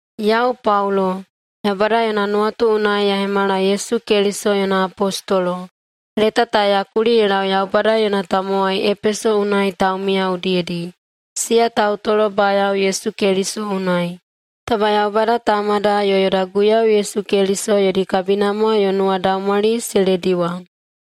Yau Paulo, Yaubada yona nuwatu unai ya hemala Yesu Keliso yona apostolo. Leta ta ya kuli ye lau Yaubada yona tamowai Epeso unai taumiya udiyedi, siya tautolobayao Yesu Keliso unai. Taba Yaubada Tamada yo yoda Guiyau Yesu Keliso yodi kabinamwa yo nuwadaumwali se lediwa.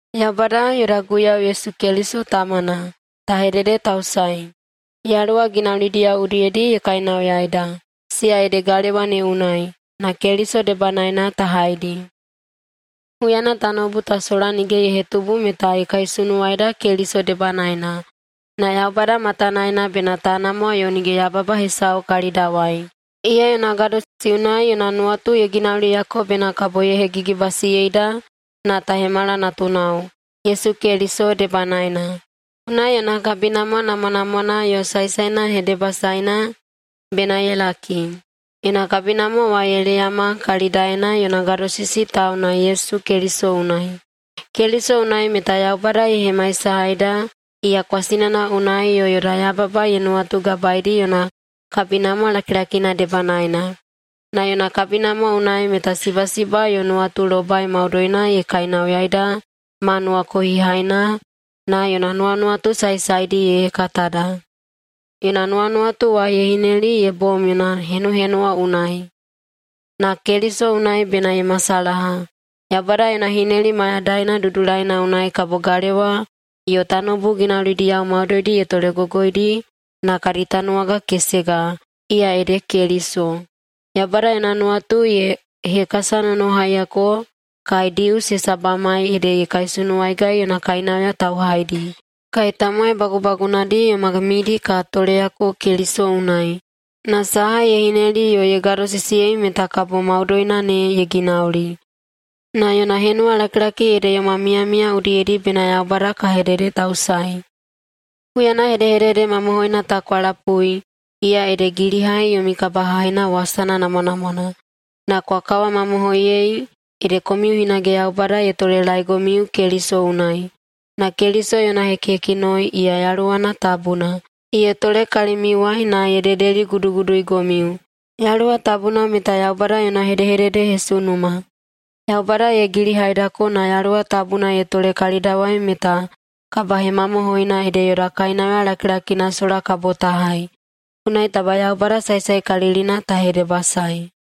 Yaubada, yoda Guiyau Yesu Keliso tamana, ta hededetausaei! Yaluwa ginaulidiyao udiyedi ye kainauyaeida, siya ede galewa ne unai, na Keliso debanaena ta haidi. Huyana tanoubu ta sola nige ye hetubu meta ye kaisunuwaida Keliso debanaena, na Yaubada matanaena bena ta namwa yo nige yababa hesau kalidawai. Iya yona gadosisi unai yona nuwatu ye ginauliyako bena kabo ye hegigibasiyeida na ta hemala natunao, Yesu Keliso debanaena. Unai yona kabinamwa namwanamwana yo saesaena hedebasaena bena ye laki. Yona kabinamwa wa ye leyama kalidaena yona gadosisi tauna Yesu Keliso unai. Keliso unai meta Yaubada ye hemaisahaida iya kwasinana unai yo yoda yababa ye nuwatugabaedi yona kabinamwa lakilakina debanaena. Na yona kabinamwa unai meta sibasiba yo nuwatulobai maudoina ye kainauyaida ma nuwakohihaina na yona nuwanuwatu saesaedi ye hekatada. Yona nuwanuwatu wa ye hineli ye bom yona henuhenuwa unai, na Keliso unai bena ye masalaha. Yaubada yona hineli mayadaina dudulaina unai kabo galewa yo tanoubu ginaulidiyao maudoidi ye tolegogoidi na kadi tanuwaga kesega, iya ede Keliso. Yaubada yona nuwatu ye hekasanonohaiyako kai Dius hesabamai ede ye kaisunuwaigai yona kainauya tauhaidi, kai tamowai bagubagunadi yoma midi ka toleyako Keliso unai, na saha ye hineli yo ye gadosisiyei meta kabo maudoina ne ye ginauli. Na yona henuwalakilaki ede yoma miyamiya udiyedi bena Yaubada ka hededetausaei. Huyana hedehedede mamohoina ta kwa lapui, iya ede gilihai yomi kabahaina wasana namwanamwana, na kwa kawamamohoiyei ede komiu hinage Yaubada ye tolelaeigomiu Keliso unai, na Keliso yona hekihekinoi, iya Yaluwana Tabuna, ye tole kalimiuwai na ye dedeliguduguduigomiu. Yaluwa Tabuna meta Yaubada yona hedehededehesunuma. Yaubada ye gilihaidako na Yaluwa Tabuna ye tole kalidawai meta kabahemamohoina ede yoda kainauya lakilakina sola kabo ta hai. Unai taba Yaubada saesaekalilina ta hedebasaei.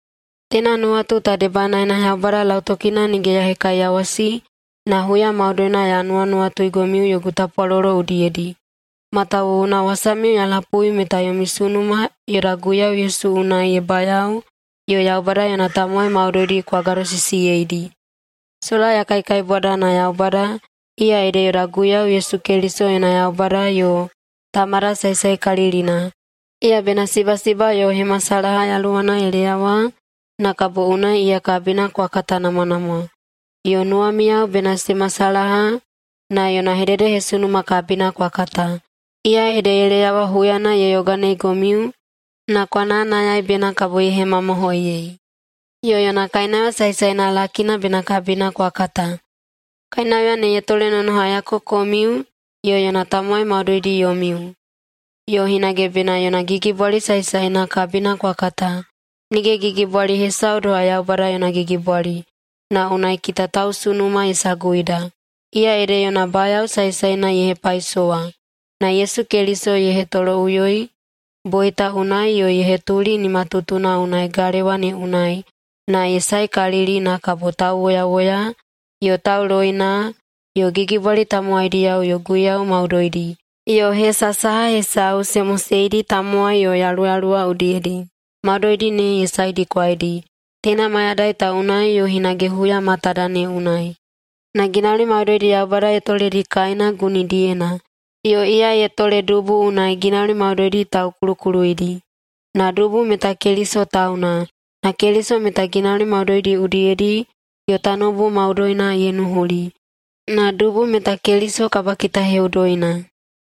Teina nuwatu ta debanaena Yaubada lautokina nige ya hekaiyawasi na huya maudoina ya nuwanuwatuigomiu yogu tapwalolo udiyedi. Matawuwuna wasamiu ya lapui meta yomi sunuma yoda Guiyau Yesu unai ye bayao yo Yaubada yona tamowai maudoidi kwa gadosisiyeidi. Sola ya kaikaibwada na Yaubada, iya ede yoda Guiyau Yesu Keliso yona Yaubada yo Tamada saesaekalilina, iya bena sibasiba yo hemasalaha yaluwana ye leyawa na kabo unai iya kabina kwa katanamwanamwa. Yo nuwamiyao bena se masalaha na yona hededehesunuma kabina kwa kata, iya ede ye leyawa huyana ye yoganeigomiu na kwa nayanayai bena kabo ye hemamohoiyei. Yo yona kainauya saesaena lakina bena kabina kwa kata. Kainauya ne ye tolenonohaiyako komiu yo yona tamowai maudoidi yomiu. Yo hinage bena yona gigibwali saesaena kabina kwa kata. Nige gigibwali hesau doha Yaubada yona gigibwali. Na unai kita tausunuma ye saguida. Iya ede yona bayao saesaena ye hepaisowa na Yesu Keliso ye hetoloꞌuyoi boita unai yo ye hetuli nimatutuna unai galewa ne unai na ye saekalili na kabo tauwoyawoya yo tauloina yo gigibwali tamowaidiyao yo guiyau maudoidi, yo hesa saha hesau se moseidi tamowai yo yaluyaluwa udiyedi, maudoidi ne ye saedikwaidi, teina mayadai ta unai yo hinage huya matada ne unai. Na ginauli maudoidi Yaubada ye toledi kaena gunidiyena, yo iya ye tole dubu unai ginauli maudoidi taukulukuluyeidi. Na dubu meta Keliso tauna, na Keliso meta ginauli maudoidi udiyedi yo tanoubu maudoina ye nuhuli, na dubu meta Keliso kabakitaheꞌudoina.